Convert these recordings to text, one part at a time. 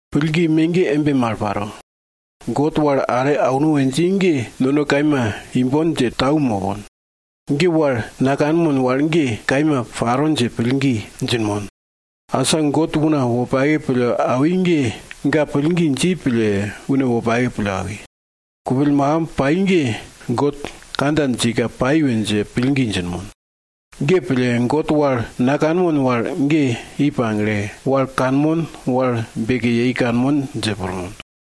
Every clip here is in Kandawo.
Pillgi me ge embe mal paro. God wal are auno we dji ge nono kaima imbon dje tau mopon. Wal nakanmon wal ge kaima paro dje pillgi djinmon. Asa, God una wopake pille awi ge, ga pillgi dji pille, une wopake pille awi. Kupill makimb pai ge, God kandja djika pai we dje pillgi djinmon. Ge pille, God wal nakanmon wal ge i pagle, wal kanmon wal beke yei kanmon dje pirmon.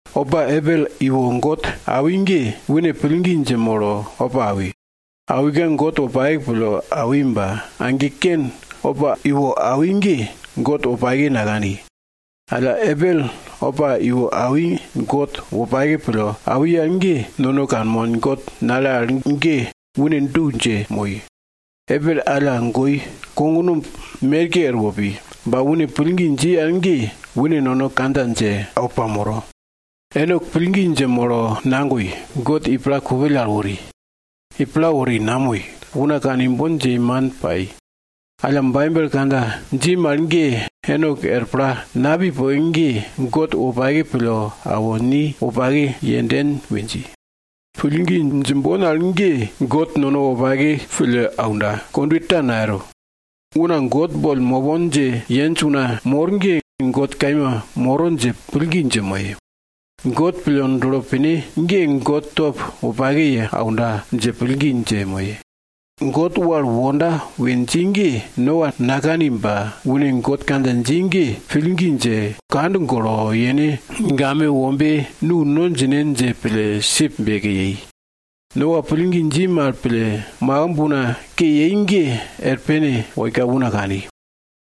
Opa Abel iwo God awi ge, une pillgi dje molo opa awi. Awika God wopake pille awi ba age Kein opa iwo awi ge, God wopake nakani. Alla, Abel opa iwo awi God wopake pille awi al ge, nono kanmon God nale al ge une du dje moi. Abel alla goi, kognumb merke er wopi, ba une pillgi dji al ge, une nono kandja dje awo pamoro. Enok pillgi dje molo nagoi, God i pla kupill al wori. I pla wori, namoi, una kane imbon dje yei, man pai. Alla Baibel kandja dji mal ge, Enok er pla napi poke ge, God wopake pille awo ni wopake yenden we dji. Pillgi djimbon al ge God nono wopake pille aunda, kondwe ta nayero. Una God boll mopon dje yenj una mor ge, God kaima moro dje pillgi dje moye. God pille dulo pine ge, God top wopake ye aunda dje pillgi dje moye. God wal wonda we dji ge, Noa nakani ba une God kandja dji ge, pillgi dje, kand golo, yene game wombaye nu no djine dje pille sip beke yei. Noa pillgi dji mal pille, makimb una ke yei ge er pene woika una kani.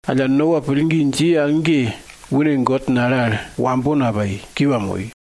Alla, Noa pillgi dji al ge, une God nale al wambo napai, kiwa moi.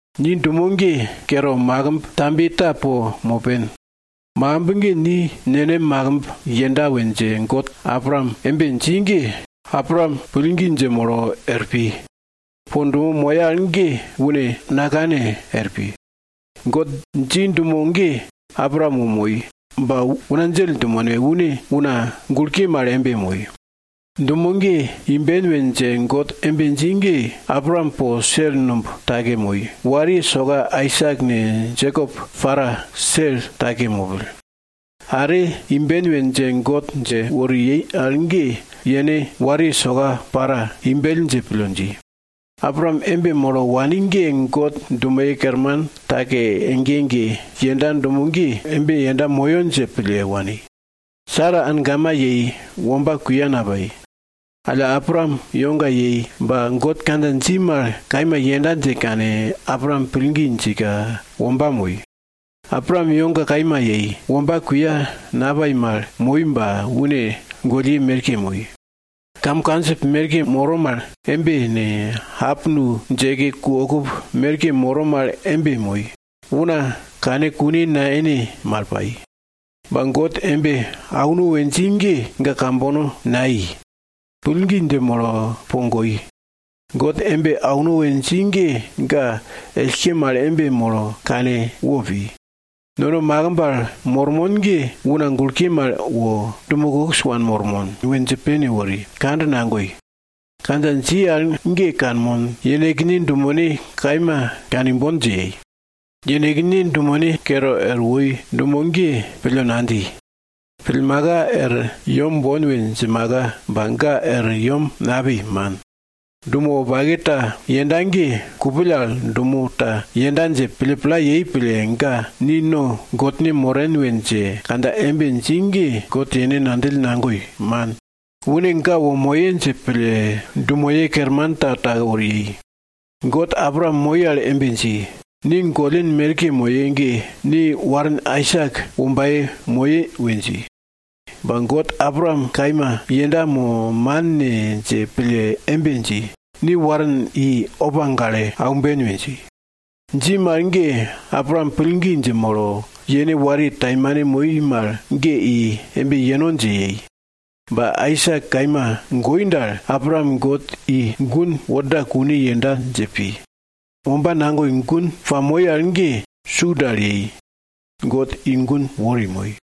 Ni dumo ge kere makimb tambiye ta po mopen. Makimb ge ni nenem makimbin yenda we dje God Abraam embe dji ge, Abraam pillgi dje molo er pi. Po dumo moya al ge une nakane er pi. God dji dumo ge, Abraam wo moi, ba una djell dumene, une una gulke mal embe moi. Dumo ge imben we dje God embe dji ge, Abraam po sel numb take moi, wariye soka Aisak ne, Jekop para sel take mopill. Are imben we dje God dje wori yei al ge yene wariye soka para imbell dje pille dji. Abraam embe molo wani ge, God dumoye kerman take ege ege yenda dumo ge, embe yenda moyo dje pille wani. Sara angama yei, womba kuya napai. Alla Abraam iwoga yei ba God kandja dji mal kaima yenda dje kane, Abraam pillgi djika womba moi. Abraam iwoga kaima yei, womba kuya napai mal moi ba une gollye merkeke moi. Kam kandjip merke moro mal embe ne, solwara djeke ku okup merke moro mal embe moi. Una kere kane kune nayene mal pai. Ba God embe auno we dji ge, ga kambono nai. Pillgi dje molo po goi. God embe auno we dji ge, ga ellke mal embe molo kane wopi. Nono makimb al mormon ge una gulke mal wo, dumo kokis wanmormon we dje pene wori, kand nagoi. Kandja dji al ge, kanmon, yenekne dumene kaima kane imbon dje yei. Yenekne dumene kere er woi dumo ge pille nadji. Pillmaka, er yem bon we djimaka Ba ga er yem napi, man. Dumo wopake ta yenda ge, kupill al dumo ta yenda dje pille pla yei pille, ga ni no Godne moren we dje kandja embe dji ge, God yene ngandjill nagoi, man. Une ga wo moye dje pille siti kerman ta take wori yei. God Abraam moi al embe dji, ni gollin merke moye ge, ni warin Aisak wombaye moye we dji. Ba, God Abraam kaima yenda mo man ne dje pille embe dji, ni warin i opa gale aumben we dji. Dji mal ge, Abraam pillgi dje molo yene wariye taimane moi mal ge i embe yeno dje yei. Ba Aisak kaima goi dal, Abraam God i gun worda kune yenda dje pi. Womba nagoi gun pamoi al ge, su dal yei. God i gun wori moi.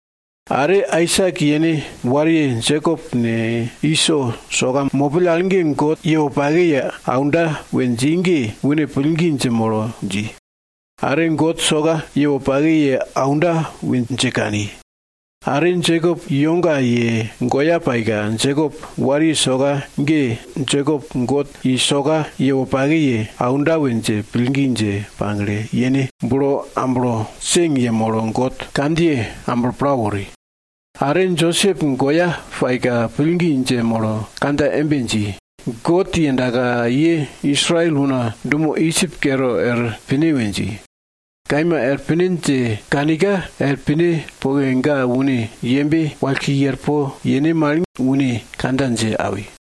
Are Aisak yene wariye Jekop ne, Iso soka mopill al God ye wopake ye aunda we dji ge, une pillgi dje molo dji. Are God soka ye wopake ye aunda we dje kani. Are Jekop iwoga ye goya paika, Josep wariye soka ge Jekop God ye soka ye wopake ye aunda we dje pillgi dje pagle, yene bulo amblo seng yemolo God kandjiye amblo pla wori. Are Josep goya paika, pillgi dje molo kandja embe dji, God yendaka ye Israel una dumo Idjip kere er pine we dji. Kaima er pine dje kanika, er pine poke, ga une yembe wallko i er po yene mal une kandja dje awi.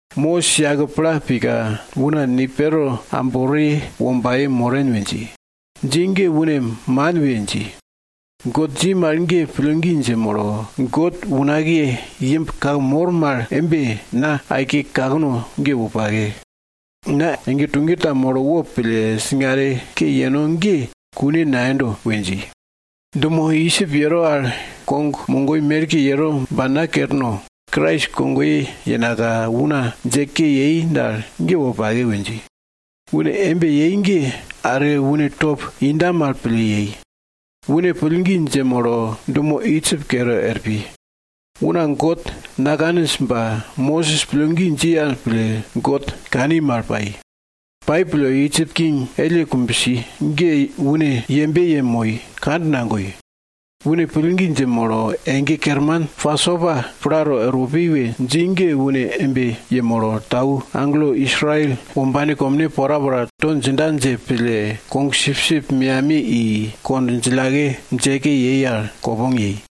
Mosis yake pla pika, una ni Pero ambore wombaye moren we dji. Dji ge une man we dji. God dji mal ge pillgi dje molo, God unakiye imb kake mor mal embe, na po aike kakno ge wopake. Na ege tuge ta molo wopille singare ke yeno ge kune nayendo we dji. Dumo Idjip yero al kog mogoi merke yero ba na kerno, Krais kogoye yenaka una dje ke yei dal ge wopake we dji. Une embe yei ge are une top inda mal pille yei. Une pillgi dje molo dumo Idjip kere er pi. Una God nakaninj ba Mosis pillgi dji al pille God kani mal pai. Pai pille, Idjip king elle kumbsi ge une yembe yemoi, kand nagoi. Une pillgi dje molo ege kerman Pasopa plato erwo punda we dji ge une embe yemolo, tau agelo Israel wombane komne porapora to djinda dje pille kogsipsip meyamiye i kond djillake djeke yei al kopong yei.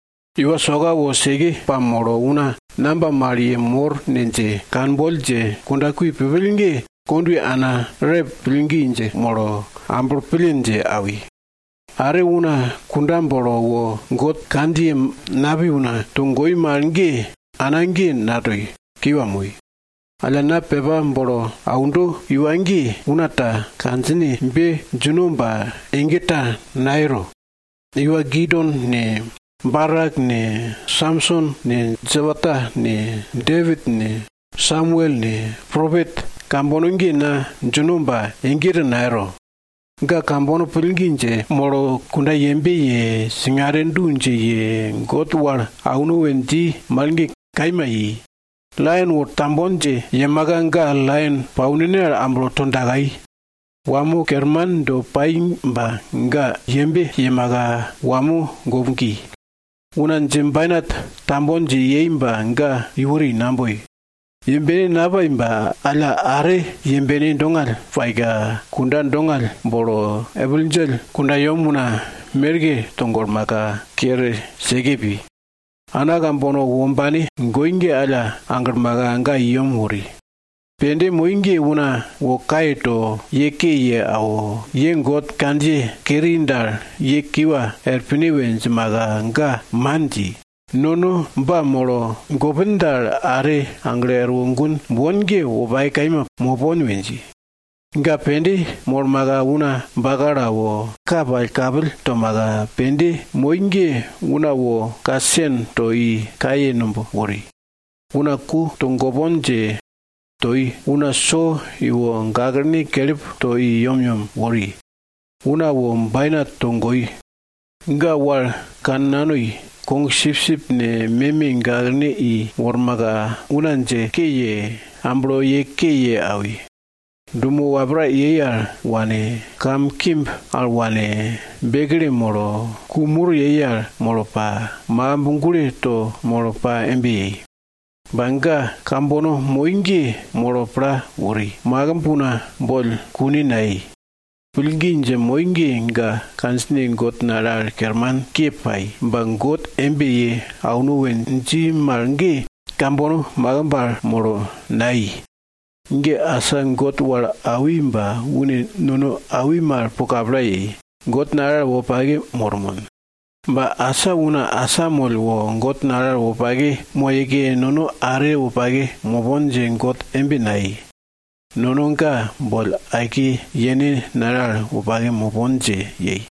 Iwa soka wo seke pamolo una namba mal ye mor ne dje kanboll dje kundakui pupill ge kondwe ana Raep pillgi dje molo amblo pille dje awi. Are una kunda bolo wo God kandjiye napi una togoi mal ge ana ge natoi, kiwa moi. Alla na pepa bolo aundo iwa ge, una ta kandjinebe djino ba ege ta nayero. Iwa Gideon ne, Barak ne, Samson ne, Jepta ne, Depit ne, Samuel ne, propet kambono ge na djino ba ege ta nayero. Ga kambono pillgi dje molo kunda yembe ye, singare du dje ye, God wal auno we dji mal ge kaima i. Laion wo tambon dje yemaka ga laion paunene al amblo to dakai. Wamo kerman do pai ba ga yembe yemaka wamo gomgi, una djebainat tambon dje yei ba ga iwori, naboi. Yembene napai ba alla are yembene dongall paika, kunda dongall bolo epil djell kundayem una merke togolmaka kere seke pi. Ana kambono wombane goi ge alla aglmaka ga i yem wori. Pende moi ge una wo kaye to ye ke ye awo, ye God kandjiye keri dal ye kiwa er pine we djimaka ga man dji. Nono ba molo gopin dal, are aglo erwo gun bon ge wopake kaima mopon we dji. Ga pende molmaka una bakalo awo, ka pirngangill tomaka, pende moi ge, una wo ka sen to i kaye numb wori. Una ku togopon dje toi, una so iwo gaklene kelip to i yemyem wori. Una wo bainat togoi. Ga wal kannanoi, kogsipsip ne, meme gaklene i wormaka, una dje ke ye, amblo ye ke ye awi. Dumo wapra yei al wane, kamkimb al wane, bekle molo, ku mur yei al molo pa, makimb gulo to molo pa embe yei. Ba ga kambono moi ge molo pla wori, makimb una boll kune nayei. Pillgi dje moi ge, ga kandjine God nale al kermanke pai, ba God embe ye auno we dji mal ge kambono makimb al molo nai. Asa God wal awi ba une nono awi mal po kapla yei, God nale al wopake mormon. Ba asa una asamoll wo God nale al wopake moyeke nono are wopake mopon dje God embe nayei. Nono ga boll aike yene nale al wopake mopon dje yei.